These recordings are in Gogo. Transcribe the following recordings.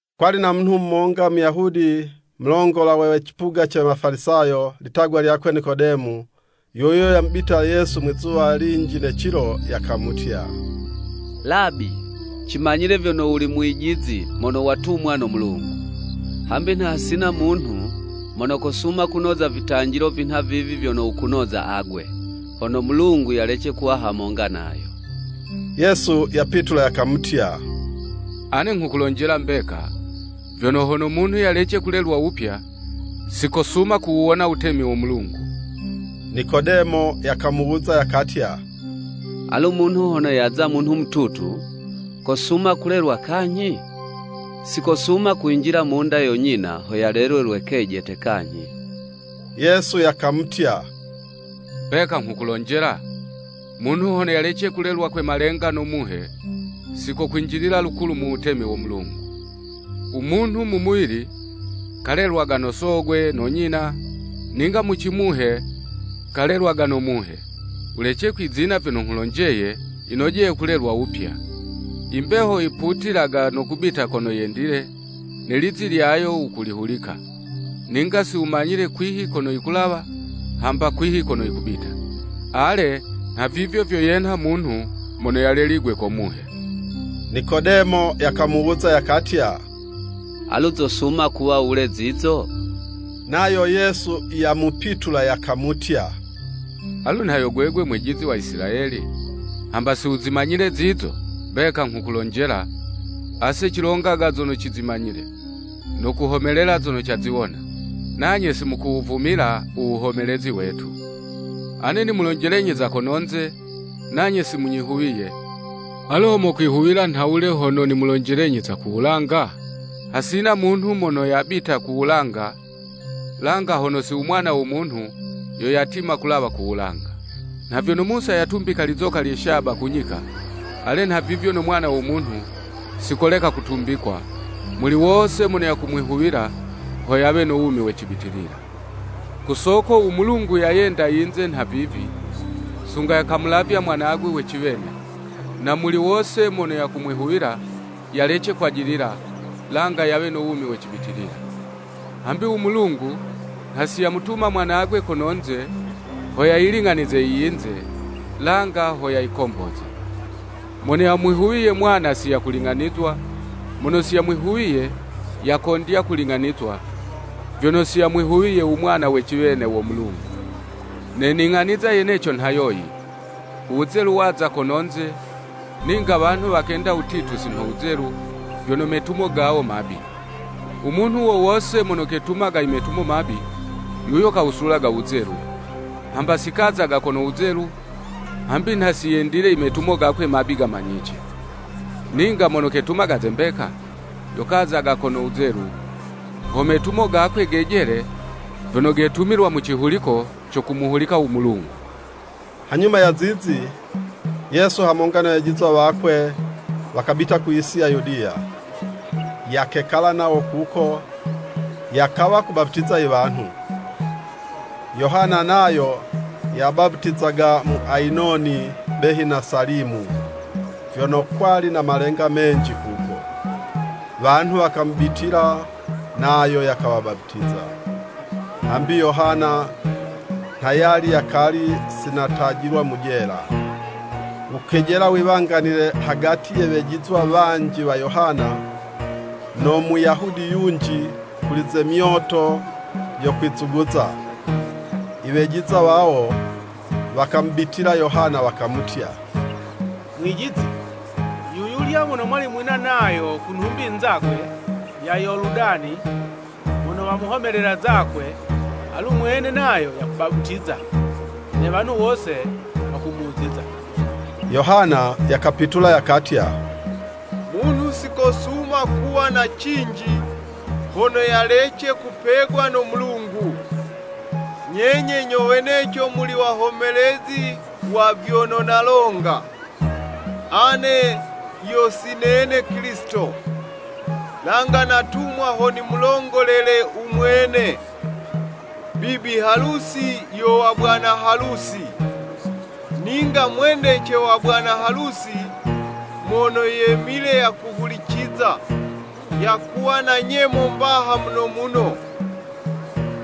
Kwali na munhu monga Muyahudi, mulongola we cipuga ce Wafalisayo, litagwa lyakwe Nikodemo. Yuyo yamubitila Yesu mwizuwa linji ne cilo, yakamutya, “Labi, cimanyile vyono wuli mwijizi mono watumwa no Mulungu. Hambi nha hasina munhu, mono kosuma kunoza vitanjilo vinha vivi vyono wukunoza agwe, hono Mulungu yalece kuwa hamonga nayo.” Yesu yapitula yakamutya, “Ane nghukulonjela mbeka, vyono hono munhu yalece kulelwa wupya, si kosuma kuwuwona wutemi wo Mulungu.” Nikodemo yakamuwuza yakatya, “Alu munhu hono yaza munhu mututu, kosuma kulelwa kanyhi? Si kosuma kwinjila mu'nda yo nyina ho yalelwe lwe kejete kanyhi.” Yesu yakamutya, “Mbeka nghukulonjela, munhu hono yalece kulelwa kwe malenga no Muhe, sikokwinjilila lukulu mu wutemi wo Mulungu. U munhu mu muwili, kalelwaga no sogwe no nyina, ninga mu cimuhe kalelwaga no muhe. Wulece kwizina, vyono nghulonjeye, yinojeye kulelwa wupya. I mbeho yiputilaga no kubita kono yendile, ne lizi lyayo wukulihulika, ninga si wumanyile kwihi kono yikulawa, hamba kwihi kono yikubita. Ale, nhavivyo vyo yenha munhu mono yaleligwe ko Muhe.” Nikodemo yakamuwuza, yakatya, “Alu zosuma kuwa wule zizo?” Nayo Yesu yamupitula yakamutya, “Alu, nha yo gwegwe mwijizi wa Isilayeli, hamba si wuzimanyile zizo?” Mbeka nghukulonjela, ase cilongaga zono cizimanyile, no kuhomelela zono caziwona, nanye si mukuwuvumila u wuhomelezi wetu. Ane nimulonjelenyi za kononze, nanye si munyihuwiye, alu ho mokwihuwila nhawule, hono nimulonjelenyi za ku wulanga? “Hasina munhu mono yabita ku wulanga, langa hono si u Mwana wo Munhu, yo yatima kulawa ku wulanga.” “Nha vyono Musa yatumbika lizoka lye shaba ku nyika, ale nhavivyo no Mwana wo Munhu, si koleka kutumbikwa, muli wose mono yakumwihuwila, ho yawe no wumi we cibitilila. Ku soko u Mulungu yayenda yinze nha vivi, sunga yakamulavya Mwanagwe we ciwene, na muli wose mono yakumwihuwila, yalece kwajilila, langa yawe no wumi we cibitilila. Hambi u Mulungu, nha si yamutuma Mwanagwe kononze, ho yayiling'anize iyinze, langa ho yayikomboze. “Mono yamwihuwiye mwana si yakuling'anizwa, mono si yamwihuwiye, yakondya kuling'anizwa, vyono si yamwihuwiye u Mwana we ciwene wo Mulungu. Ne ning'aniza yeneco nha yoyi, uwuzelu waza kononze, ninga wanhu wakenda wutitu si nho wuzelu, vyono metumo gawo mabi. U munhu wo wose mono ketumaga i metumo mabi, yuyo kawusulaga wuzelu, hamba si kazaga kono wuzelu, hambi nha si yendile i metumo gakwe mabi gamanyice. Ninga mono ketumaga ze mbeka, yo kazaga kono wuzelu, ho metumo gakwe gejele vyono getumilwa mu cihuliko co kumuhulika u Mulungu.” Hanyuma ya zizi, Yesu hamonga ne wejizwa wakwe, wakabita ku yisi ya Yudiya, yakekala nawo kuko, yakawa kubaputiza i wanhu. Yohana nayo yabaputizaga mu Ayinoni behi na Salimu, vyono kwali na malenga menji kuko, wanhu wakamubitila, nayo yakawabaputiza. ( Hambi Yohana nha yali yakali si natajilwa mu jela.) Wukejela wiwanganile hagati ya wejizwa wanji wa Yohana, no Muyahudi yunji, kuli ze myoto yo kwizuguza. I wejizwa wawo wakamubitila Yohana, wakamutya, “Mwijizi, yuyulya mono mwali nayo ku nhumbi nzagwe ya Yoludani, mono wamuhomelela zakwe, alu mwene nayo yakubaputiza, ne wanhu wose wakumuziza.” Yohana yakapitula yakatya, “Munhu si kosuma kuwa na cinji, hono yalece kupegwa no Mulungu. Nyenye nyo weneco muli wahomelezi wa vyono nalonga, ‘Ane yo si nene Kilisito, langa natumwa ho nimulongolele u mwene.’ Bibi halusi yo wa bwana halusi, ninga mwendece wa bwana halusi, mono yemile yakuhuliciza, yakuwa na nyemo mbaha muno muno,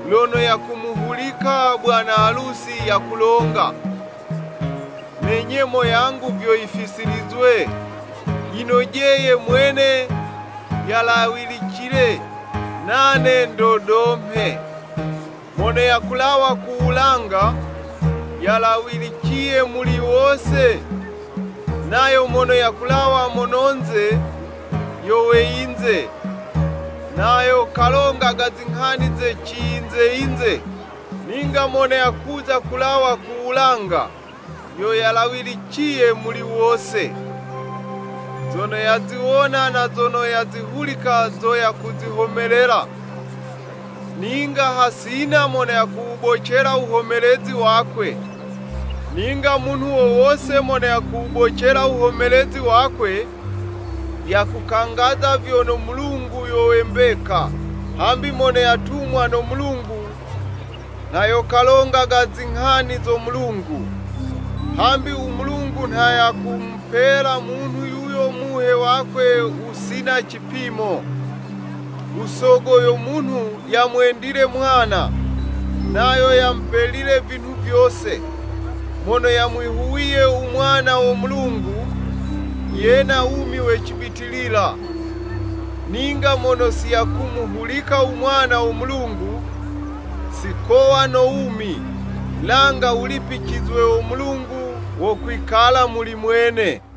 lono yakumuhulika bwana halusi yakulonga. Ne nyemo yangu vyo yifisilizwe. Yinojeye Mwene yalawilicile, nane ndodomhe.” Mono yakulawa ku wulanga, yalawiliciye muli wose, nayo mono yakulawa mono'nze, yo we yinze, nayo kalongaga zinghani ze ciyinze-yinze. Ninga mono yakuza kulawa ku wulanga, yo yalawiliciye muli wose. Zono yaziwona na zono yazihulika zo yakuzihomelela, ninga hasina mono yakuwubocela wuhomelezi wakwe. Ninga munhu wo wose mono yakuwubocela wuhomelezi wakwe, yakukangaza vyono, Mulungu yo we mbeka. Hambi mono yatumwa no Mulungu, nha yo kalongaga zinghani zo Mulungu, hambi u Mulungu nha yakumupela munhu yuyo Muhe wakwe wusina cipimo. U Sogo yo munhu yamwendile Mwana, Nayo yamupelile vinhu vyose. Mono yamwihuwiye u Mwana wo Mulungu, yena wumi we cibitilila; ninga mono si yakumuhulika u Mwana wo Mulungu, si kowa no wumi, langa wulipicizwe wo Mulungu wo kwikala muli mwene.